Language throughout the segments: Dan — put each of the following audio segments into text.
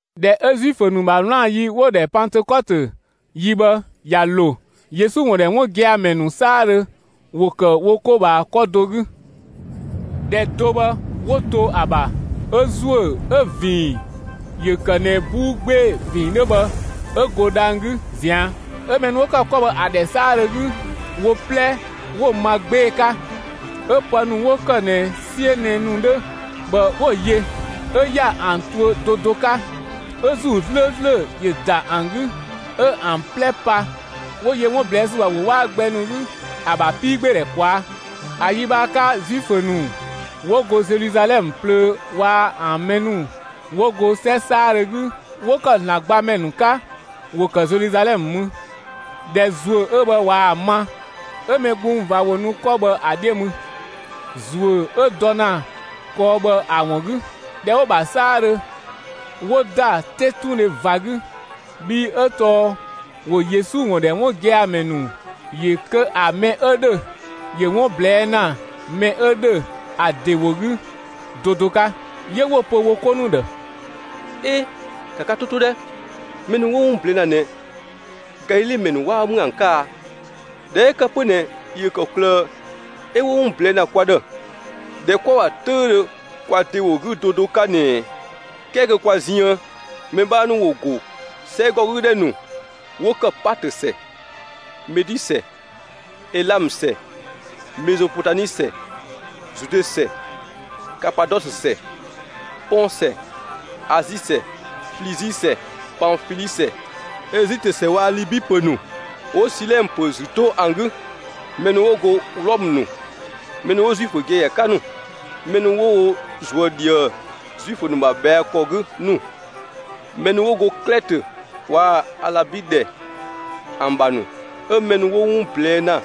꞊Dhɛ 'ö Zuifö ‑nu ‑bha 'wlaan‑ ‑yi 'wo‑ ‑dhɛ Pantëkɔtö ‑yi bhë ꞊ya ‑lo, Yesu ‑wun ‑dhɛ 'wun gia‑ ‑mɛ ‑nu 'saadhö ‑wo ‑kë wo 'ko ꞊bhaa 'kɔ do 'gü. ‑Dhɛ do bhë 'wo to ‑a ‑bha 'ö ‑zuö 'ö‑ ‑vinng ‑yö ‑kë ꞊nɛ 'buu 'gbee‑ ‑vinng 'dhö bhë 'ö go dhang‑ 'gü ꞊zian', 'ö mɛ ‑nu 'wo ‑kë 'kɔ bhë ‑a ‑dhɛ 'saadhö 'gü, wo 'plɛ 'wo‑ ma 'gbee‑ 'ka. 'Ö pë ‑nu 'wo ‑kë ꞊nɛ 'siö nɛ‑ ‑nu 'dhö bhë 'wo‑ yö, 'ö ‑ya ‑an tuö do do 'ka. 'Ö ‑Zuu 'slööslö ‑yö ‑da ‑an 'gü, 'ö ‑an 'plɛ pa, 'wo yö 'wun ꞊blɛɛ' ‑sü ‑bha ‑wo 'waa gbɛ ‑nu 'gü ‑a ‑bha 'piigbeedhɛ ꞊kwaa'. ‑A yi bhë ‑a 'ka, Zuifö ‑nu 'wo go Zeluzalɛmë plöö waa‑ ‑an mɛ ‑nu 'wo go 'sɛ 'saadhö 'gü 'wo ‑kë ‑Zlan gbamɛ ‑nu 'ka, ‑wo ‑kë Zeluzalɛmë mü. ꞊Dhɛ ‑zuö 'ö bhë ꞊waa‑ ma, 'ö‑ mɛ gbung ꞊va ‑wo nu 'kɔ bhë ‑a 'dhiö mü, ‑zuö 'ö dɔ ‑na kɔɔ bhë ‑a ‑wun 'gü. ꞊Dhɛ 'wo‑ ‑bha 'saadhö 'wo ‑da 'tetundhe ꞊va 'gü, bhii 'ö tɔɔ ‑wo Yesu ‑wun ‑dhɛ 'wun gia‑ ‑mɛ ‑nu ‑yö kö ‑a mɛ 'ö ‑dhö ‑yö 'wun ꞊blɛɛ' ‑na mɛ 'ö ‑dhö ‑a ‑de ‑wo 'gü do do 'ka. 'Yö 'wo‑ pö wo 'ko ‑nu ‑dhë: «'E, ‑ka ka 'to 'to 'dhɛ! Mɛ ‑nu 'wo 'wun ꞊blɛɛ' ‑na ꞊nɛ, Galile ‑mɛ ‑nu 'waa ‑mü ‑an 'ka a? ꞊Dhɛ 'ö ‑kë 'pö ꞊nɛ ‑yö ‑kɔklë 'ö 'wo 'wun ꞊blɛɛ' ‑na kwa ‑dhë, ‑dhɛ 'kwa‑ ‑bha 'töüdhö kwa ‑de ‑wo 'gü do do 'ka ꞊nɛɛ? 'Kɛɛ kö kwa ziën, mɛ 'bhaa ‑nu ‑wo ‑go 'sɛgɔgüdhɛ ‑nu 'wo ‑kë Paatö ‑sɛ, Medi ‑sɛ, Elamë ‑sɛ, Mezopotami ‑sɛ, Zude ‑sɛ, Kapadɔsö ‑sɛ, Pɔng ‑sɛ, Azi ‑sɛ, Flizi ‑sɛ, Panfili ‑sɛ, Ezitö ‑sɛ waa‑ Libi ‑pö ‑nu 'wo Silɛnë ‑pö ‑zü 'to ‑an 'gü. Mɛ ‑nu 'wo go Wlɔmë ‑nu, mɛ ‑nu 'wo Zuifö giagia 'ka ‑nu, mɛ ‑nu 'wo wo ꞊zuö' ꞊dhië Zuifö ‑nu ‑bha ꞊bhɛa' ‑kɔ 'gü ‑nu, mɛ ‑nu 'wo go Klɛtö waa‑ Alabi ‑dhɛ ‑an ‑bha ‑nu, 'ö mɛ ‑nu 'wo 'wun ꞊blɛɛ' ‑na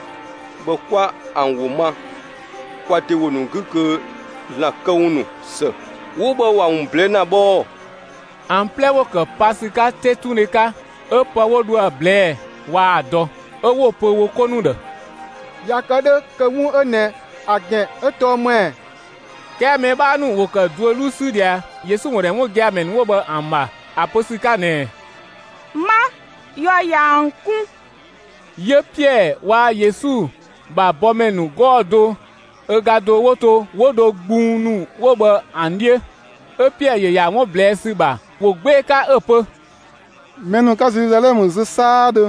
bhë 'kwa ‑an ‑wo ma kwa ‑de ‑wo ‑nu 'gü kö ‑Zlan këwun ‑nu ‑së 'wo bhë ‑wa ‑wun ꞊blɛɛ' ‑na bhë ‑ɔɔ.» ‑An 'plɛ ‑wo ‑kë pa ‑sü 'ka 'tetundhe 'ka, 'ö pë 'wo dho ‑a ꞊blɛɛ waa‑ dɔ. 'Ö 'wo‑ pö wo 'ko ‑nu ‑dhë: «꞊Ya kë 'dhö kö 'wun 'ö ꞊nɛ ‑a ‑gɛn 'ö tɔɔ ‑më ‑ɛ?» 'Kɛɛ mɛ 'bhaa ‑nu ‑wo ‑kë duö 'luu 'sü ꞊dhia, Yesu ‑wun ‑dhɛ 'wun gia‑ ‑mɛ ‑nu 'wo bhë ‑an ‑bha ‑a pö ‑sü 'ka ꞊nɛɛ: «'Ma, yɔ ꞊ya ‑an 'kun!» 'Yö Piɛɛ waa‑ Yesu ‑bha bɔmɛ ‑nu 'gɔɔ‑ do ö ga do 'wo to 'wo dho mɛ gbung ‑nu 'wo bhë ‑an 'dhiö, 'ö Piɛɛ ‑yö ‑ya 'wun ꞊blɛɛ' ‑sü ‑bha ‑wo 'gbee‑ 'ka 'ö‑ pö: «Mɛ ‑nu 'ka Zeluzalɛmë zö 'saadhö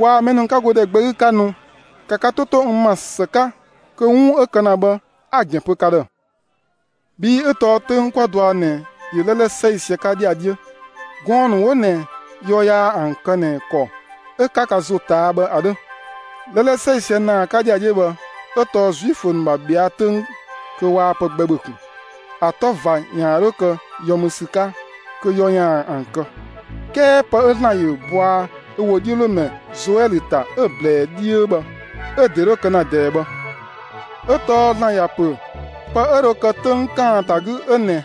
waa‑ ‑mɛ ‑nu 'ka go ‑dhɛ gbɛ 'gü 'ka nu, ‑ka ka 'to 'to n ‑ma ‑së 'ka kö 'wun 'ö kë ‑na bhë 'a‑ ‑gɛn pö ka ‑dhë! Bhii 'ö tɔɔ 'töng 'kwa dɔa ꞊nɛ ‑yö 'lɛlɛ 'sɛisië 'ka ‑dhiadhiö; gɔɔn‑ ‑nu 'wo ꞊nɛ yɔ yaa ‑an kë ꞊nɛ ‑kɔ 'ö 'ka ka ‑zo ꞊taa' bhë ‑a 'dhö ('lɛlɛ 'sɛisië ‑naa 'ka ‑dhiadhiö bhë 'ö tɔɔ Zuifö ‑nu ‑bha ꞊bhɛa' 'töng kö waa pë gbɛ ‑bhö ꞊kun. ‑A 'tɔ ꞊va ‑yaan 'dho kë yɔ ‑mü ‑sü 'ka kö yɔ ‑yaan ‑an kë). 'Kɛɛ pë 'ö ‑Zlan ‑yö bɔa ö ‑wodhiölomɛ Zoɛlö ‑ta 'ö‑ ꞊blɛɛ 'dhiö bhë 'ö‑ ‑de 'dho kë ‑na ꞊dɛɛ bhë. 'Ö tɔɔ ‑Zlan ‑ya ‑pö pë 'ö dho kë 'töng ‑kaanta 'gü 'ö ꞊nɛɛ: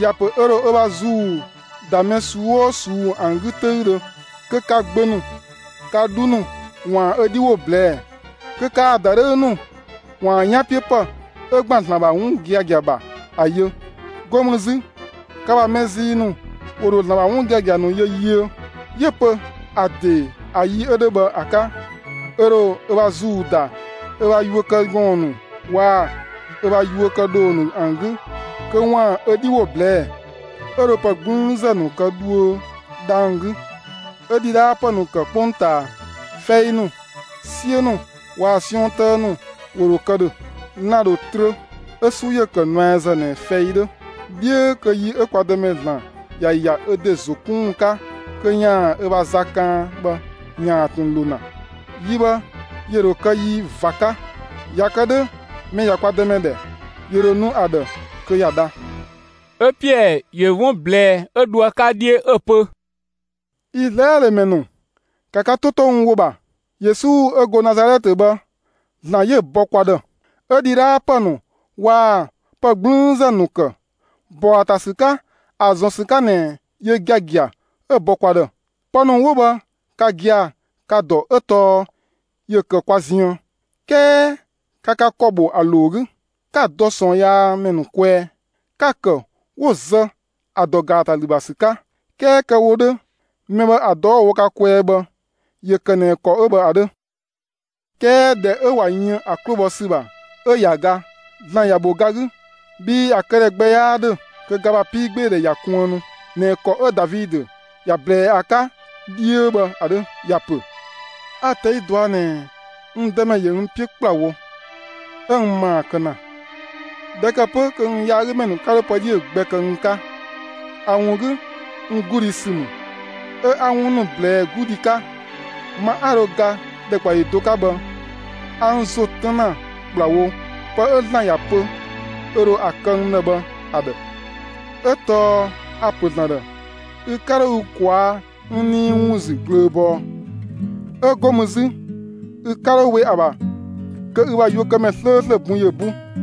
‑Ya ‑pö ö ‑dho ö ‑bha ‑zuu ‑da mɛ ꞊suu'‑ 'oo ꞊suu'‑ ‑an 'gü 'töüdhö, kö ka gbö ‑nu, ka 'dhu ‑nu ‑waan ö 'dhi ‑wo ꞊blɛɛ'‑, kö kaa‑ ‑dadhëü ‑nu ‑waan 'yanpiöpë 'ö ‑gban ‑Zlan ‑bha 'wun giagia ‑bha ‑a yö; 'go mü 'zü, ka ‑bha mɛ zii ‑nu ‑wo ‑dho ‑Zlan ‑bha 'wun giagia ‑nu yö yiö. 'Yö‑ pö ‑a ‑de ‑a yi 'ö 'dhö bhë ‑a 'ka, ö ‑dho ö ‑bha ‑zuu ‑da ö ‑bha yuökëgɔɔn ‑nu waa‑ ö ‑bha yuö kë ‑dhoo ‑nu ‑an 'gü kö ‑waan ö 'dhi ‑wo ꞊blɛɛ'‑. 'Ö dho pë 'gblüünzë ‑nu kë dhuö dhang‑ 'gü, 'ö ‑dhidhaapë ‑nu ‑kë 'kpongtaa. Fɛi ‑nu, 'siö ‑nu waa‑ 'siɔn 'tëë ‑nu ‑wo ‑dho kë ‑dhö. Lan‑ ‑dho trö, 'ö 'su ‑yö ‑kë nuɛazë ꞊nɛ fɛi 'dhö, 'dhiö kö yi 'ö kwa Dëmɛ ‑Zlan ‑ya ‑ya ö ‑de ‑zo 'kun ‑wun 'ka kö ‑yaan ö ‑bha za kaan bhë ‑yaan ꞊tun ‑lo ‑na. Yi bhë ‑yö ‑dho kë yi ꞊va 'ka. ꞊Ya kë 'dhö mɛ ꞊ya kwa Dëmɛ ‑dhɛ, ‑yö ‑dho nu ‑a ‑dhë kö ‑ya dha.» 'Ö Piɛɛ ‑yö 'wun ꞊blɛɛ 'ö dho ‑a 'ka 'dhiö 'ö‑ pö: «Izlaɛlö ‑mɛ ‑nu, ‑ka ka 'to 'to n ‑wo ‑bha! Yesu 'ö 'go Nazalɛtë bhë, ‑Zlan 'yö‑ bɔ kwa ‑dhë. 'Ö ‑dhidhaapë ‑nu waa‑ pë 'gblüünzë ‑nu ‑kë, ‑bɔ ‑a ‑ta ‑sü 'ka, ‑a ‑zɔn ‑sü 'ka ꞊nɛ yö giagia 'ö‑ bɔ kwa ‑dhë. Pë ‑nu 'wo bhë ka gia‑ ka‑ ‑dɔ 'ö tɔɔ ‑yö ‑kë kwa ziën. 'Kɛɛ ka ka ‑kɔ ‑bho ‑a ‑loo 'gü, 'ka‑ dɔ ꞊sɔɔnyaamɛ ‑nu kwɛɛ, 'ka‑ ‑kë 'wo‑ zë ‑a ‑dɔ ‑gaatalü ‑bha ‑sü 'ka. 'Kɛɛ kë‑ wo 'dhö, mɛ bhë ‑a dɔ 'wo‑ wo ka kwɛɛ bhë, ‑yö ‑kë ꞊nɛ ‑kɔ 'ö bhë ‑a 'dhö. 'Kɛɛ ꞊dhɛ 'ö ꞊wa yën ‑a 'klo bhɔ ‑sü ‑bha 'ö ꞊ya ga, ‑Zlan ‑ya ‑bho ga 'gü, bhii ‑a këdhɛ gbɛ 'yaa ‑dhö kö ga ‑bha 'piigbeedhɛ ‑ya kuënnu ꞊nɛ ‑kɔ 'ö Davidö ‑ya ꞊blɛɛ ‑a 'ka 'dhiö bhë ‑a 'dhö. ‑Ya ‑pö: A‑ ꞊tɛi' ꞊dua' ꞊nɛɛ n Dëmɛ ‑yö n 'piö ‑kplawo, 'ö n ‑maa kë ‑na. ꞊Dhɛ ‑kë 'pö kö n yaagümɛ ‑nu 'ka 'dho pë 'dhiö‑ gbɛ kë n 'ka. ‑A ‑wun 'gü, n 'gludhi ‑sü ‑mü, 'ö 'a 'wun ‑nu ꞊blɛɛ 'gludhi 'ka. Ma 'a dho ga ‑dhɛkpaɔyi do 'ka bhë, a n ‑zo 'tën ‑na ‑kplawo pë 'ö ‑Zlan ‑ya pö ö ‑dho ‑a kë n ‑dhë bhë ‑a ‑dhë. 'Ö tɔɔ a‑ ‑pö ‑Zlan ‑dhë: Ü 'ka 'dho ü ꞊kwaa'‑ n nii ‑wun ‑zü ꞊glööbɔɔ, 'ö 'go mü 'zü, ü 'ka 'dho we ‑a ‑bha kö ü ‑bha yuökëmɛ 'slööslö bun ‑yö 'bu.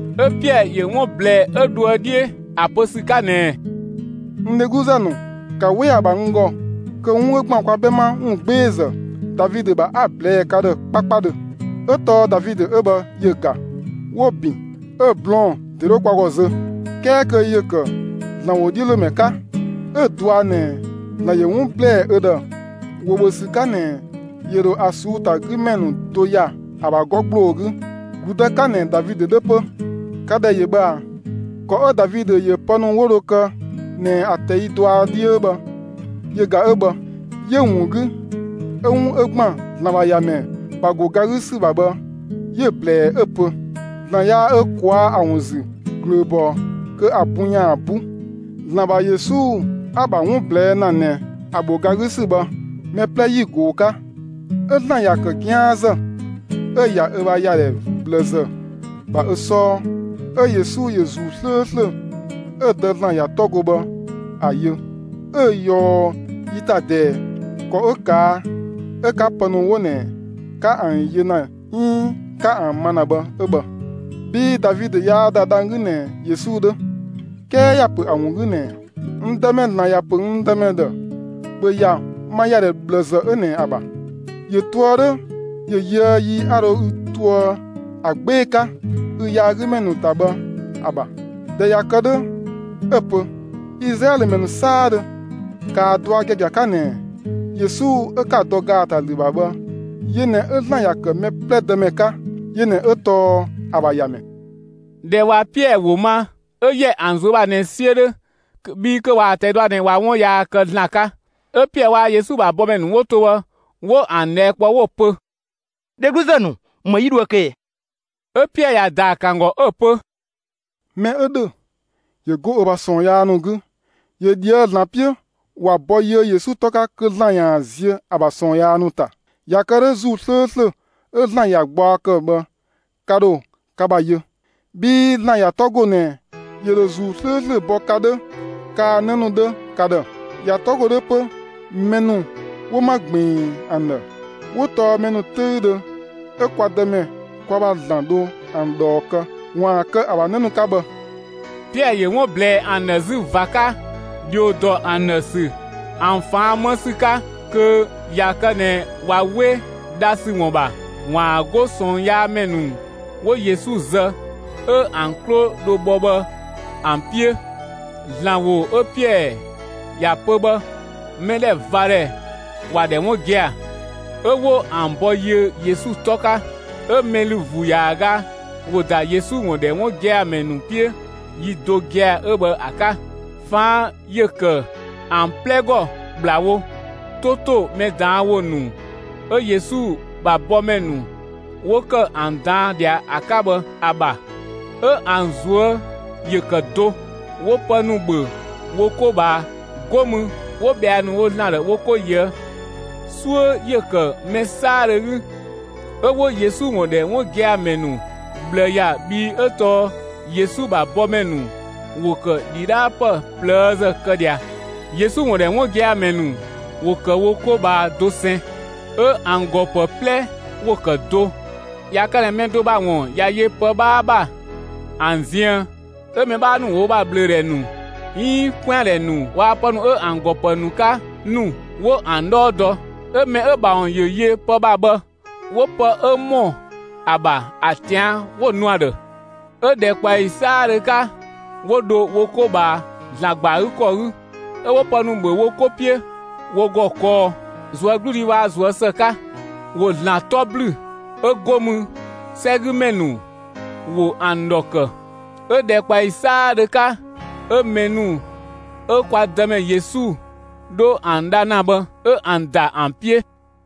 'Ö Piɛɛ ‑yö 'wun ꞊blɛɛ 'ö dhoë 'dhiö ‑a pö ‑sü 'ka ꞊nɛɛ: «N dhegluzë ‑nu, ‑ka 'we ‑a ‑bha n ‑gɔ kö 'wun 'ö ‑gban kwa 'bhɛma ‑wungbeezë Davidö ‑bha 'a‑ ꞊blɛɛ'‑ ka ‑dhë 'kpakpadhö. 'Ö tɔɔ Davidö 'ö bhë ‑yö ‑ga, 'wo‑ ‑bin, 'ö‑ blɔɔn‑ ‑de 'dhö kwa ‑gɔ zö. 'Kɛɛ kö ‑yö ‑kë ‑Zlan ‑wodhiölomɛ 'ka, 'ö‑ dɔa ꞊nɛ ‑Zlan ‑yö 'wun ‑blɛɛ ö ‑dhë ‑wo ‑bhö ‑sü 'ka ꞊nɛ yö ‑dho ‑a ꞊suu'‑ ‑ta 'gü ‑mɛ ‑nu do ‑ya ‑a ‑bha 'gɔ ‑gbloo 'gü, ‑gludë 'ka ꞊nɛ Davidö 'dhö 'pö. Ka ‑dhɛ ‑yö bhë ꞊a! ‑Kɔ 'ö Davidö ‑yö pë ‑nu 'wo dho kë ꞊nɛ ‑a ꞊tɛi' dɔa 'dhiö bhë yö ‑ga 'ö bhë. 'Yö‑ ‑wun 'gü, 'ö 'wun 'ö ‑gban ‑Zlan ‑bha ‑Yamɛ ‑bha ‑go ga 'gü ‑sü ‑bha bhë 'yö‑ ꞊blɛɛ 'ö‑ pö: ‑Zlan yaa ö ꞊kwaa' ‑a ‑wun ‑zü ꞊glööbɔɔ kö ‑a bun ‑yaan 'bu. ‑Zlan ‑bha Yesu 'a‑ ‑bha 'wun ꞊blɛɛ' ‑na ꞊nɛ ‑a ‑bho ga 'gü ‑sü bhë, mɛ 'plɛ 'yi‑ ꞊goo‑ 'ka. 'Ö ‑Zlan ‑ya ‑kë 'gianzë 'ö‑ ‑ya ö ‑bha ‑yadhɛ ꞊bhlëzë ‑bha ö 'sɔɔ. 'Ö Yesu ‑yö ‑Zuu 'slööslö 'ö‑ Dë ‑Zlan ‑ya 'tɔ go bhë ‑a yö, 'ö‑ ꞊yɔɔ yi ‑ta ꞊dɛɛ. ‑Kɔ 'ö ꞊kaa' 'ö 'ka pë ‑nu 'wo ꞊nɛ 'ka ‑an yö ‑na 'iin 'ka ‑an ma ‑na bhë 'ö bhë. Bhii Davidö yaa ‑da dhang‑ 'gü ꞊nɛ Yesu 'dhö; 'kɛɛ ‑ya ‑pö ‑a ‑wun 'gü ꞊nɛɛ: N Dëmɛ ‑Zlan ‑ya ‑pö n dëmɛ ‑dhë: ‑Bhö ‑ya ma ‑yadhɛ ꞊bhlëzë 'ö ꞊nɛ ‑a ‑bha. ‑Yö toë 'dhö ‑yö yöë yi 'a dho ü toë ‑a 'gbee‑ 'ka ü yaagümɛ ‑nu ‑ta bhë ‑a ‑bha! ꞊Dhɛ ꞊ya kë 'dhö 'ö‑ pö: Izlaɛlö ‑mɛ ‑nu 'saadhö, ‑kaa dɔa giagia 'ka ꞊nɛɛ: Yesu 'ö 'ka‑ dɔ ‑gaatalü ‑bha bhë, yö ꞊nɛ 'ö ‑Zlan ‑ya ‑kë mɛ 'plɛ Dëmɛ 'ka. Yö ꞊nɛ 'ö tɔɔ ‑a ‑bha ‑Yamɛ.» ꞊Dhɛ ꞊wa Piɛɛ ‑wo ma, 'ö ‑yɛ ‑an ꞊zuö' ‑bha ꞊nɛ 'siö 'dhö, (bhii kö ꞊waa‑ ꞊tɛi' dɔa ꞊nɛ 'wa 'wun yaa kë ‑Zlan 'ka). 'Ö Piɛɛ waa‑ Yesu ‑bha bɔmɛ ‑nu 'wo to bhë 'wo ‑an ꞊dhɛɛ' kpɔ 'wo‑ pö: «Dhegluzë ‑nu, ‑më 'yi dhoë‑ kë ꞊ɛ?» 'Ö Piɛɛ ‑ya ‑daa ‑kë ‑an ‑gɔ 'ö‑ pö: «Mɛ 'ö ‑dhö, ‑yö 'go ö ‑bha ꞊sɔɔn yaa ‑nu 'gü, ‑yö ꞊dhië'‑ ‑Zlan 'piö, ‑wa bɔ yiö Yesu 'tɔ 'ka kö ‑Zlan ‑yaan ziö ‑a ‑bha ꞊sɔɔn yaa ‑nu ‑ta! ꞊Ya kë 'dhö ‑Zuu 'slööslö 'ö ‑Zlan ‑ya gbaɔ ‑kë bhë ka ‑dho ka ‑bha yö. Bhii ‑Zlan ‑ya 'tɔ ‑go ꞊nɛ ‑yö ‑dho ‑Zuu 'slööslö bɔ ka 'dhö, kaa‑ 'në ‑nu 'dhö ka ‑dhë. ‑Ya 'tɔ ‑go 'dhö 'pö mɛ ‑nu 'wo 'ma ꞊gbiin ‑an ‑dhë 'wo tɔɔ mɛ ‑nu 'töüdhö 'ö kwa Dëmɛ kwa ‑bha ‑Zlan dho ‑an ꞊dhɔɔ kë ‑waan kë ‑a ‑bha 'në ‑nu 'ka bhë.» Piɛɛ ‑yö 'wun ꞊blɛɛ ‑an ‑dhë 'zü ꞊va 'ka, ‑dhio ‑dɔ ‑an ‑dhë ‑sü, ‑an ꞊faan' 'më ‑sü 'ka kö ꞊ya kë ꞊nɛ ꞊wa 'we dha ‑sü ‑wun ‑bha, ‑waan 'go ꞊sɔɔnyaamɛ ‑nu 'wo Yesu zë 'ö ‑an 'klo‑ dho bhɔ bhë ‑an 'piö. ‑Zlan ‑wo 'ö Piɛɛ ‑ya pö bhë mɛdhɛvadhɛ ‑wa ‑dhɛ 'wun gia‑, 'ö 'wo ‑an ‑bɔ yiö Yesu 'tɔ 'ka. 'Ö mɛ ‑lü ‑vuu ‑yaaga ‑wo ‑da Yesu ‑wun ‑dhɛ 'wun gia‑ ‑mɛ ‑nu 'piö yi do gia‑ 'ö bhë ‑a 'ka. ꞊Faan' ‑yö ‑kë ‑an 'plɛ ‑gɔ ‑kplawo 'to ‑to mɛ ꞊daan' ‑wo ‑nu 'ö Yesu ‑bha bɔmɛ ‑nu 'wo ‑kë ‑an ꞊daan' ꞊dhia ‑a 'ka bhë ‑a ‑bha. 'Ö ‑an ꞊zuö' ‑yö ‑kë do. 'Wo pë ‑nu ‑bhö wo 'ko ꞊bhaa. 'Go mü 'wo ꞊bhɛa' ‑nu wo ‑Zlan ‑dhë wo 'ko ꞊yöë'. 'Suö ‑yö ‑kë mɛ 'saadhö 'gü, 'ö 'wo Yesu ‑wun ‑dhɛ 'wun gia‑ ‑mɛ ‑nu ꞊bhlë ‑ya, bhii 'ö tɔɔ Yesu ‑bha bɔmɛ ‑nu ‑wo ‑kë ‑dhidhaapë ꞊plëëzë kë ꞊dhia. Yesu ‑wun ‑dhɛ 'wun gia‑ ‑mɛ ‑nu ‑wo ‑kë wo 'ko ꞊bhaa dosɛn. 'Ö ‑an ‑gɔ ‑pë 'plɛ ‑wo ‑kë do. ꞊Ya kë ꞊nɛ mɛ do ‑bha ‑wun ꞊ya yö pë 'bhaa ‑bha ‑an ziën 'ö mɛ 'bhaa ‑nu ‑wo wo ‑bha ꞊bhlöödhɛ ‑nu 'iin 'kwɛandhɛ ‑nu waa‑ pë ‑nu 'ö ‑an ‑gɔ ‑pë ‑nu 'ka ‑nu, 'wo ‑an 'dhɔɔ dɔ, 'ö mɛ 'ö‑ ‑bha ‑wun ‑yö yö pë ‑bha bhë, 'wo pë 'ö ‑mɔ ‑a ‑bha ‑a ꞊tian' 'wo‑ nu ‑a ‑dhë. 'Ö ‑dhɛkpaɔyi 'saadhö 'ka 'wo dho wo 'ko ꞊bhaa, ‑Zlan ‑gba ‑a 'gü ‑kɔ 'gü; 'ö 'wo pë ‑nu ‑bhö wo 'ko 'piö wo ‑gɔ kɔɔ, ꞊zuögludhi waa‑ ꞊zuö' ‑së 'ka. ‑Wo ‑Zlan 'tɔ ‑blü, 'ö 'go mü 'sɛgümɛ ‑nu ‑wo ‑an ‑dhɔ ‑kë. 'Ö ‑dhɛkpaɔyi 'saadhö 'ka 'ö mɛ ‑nu 'ö kwa Dëmɛ Yesu 'dho ‑an dha ‑na bhë 'ö ‑an ‑da ‑an 'piö.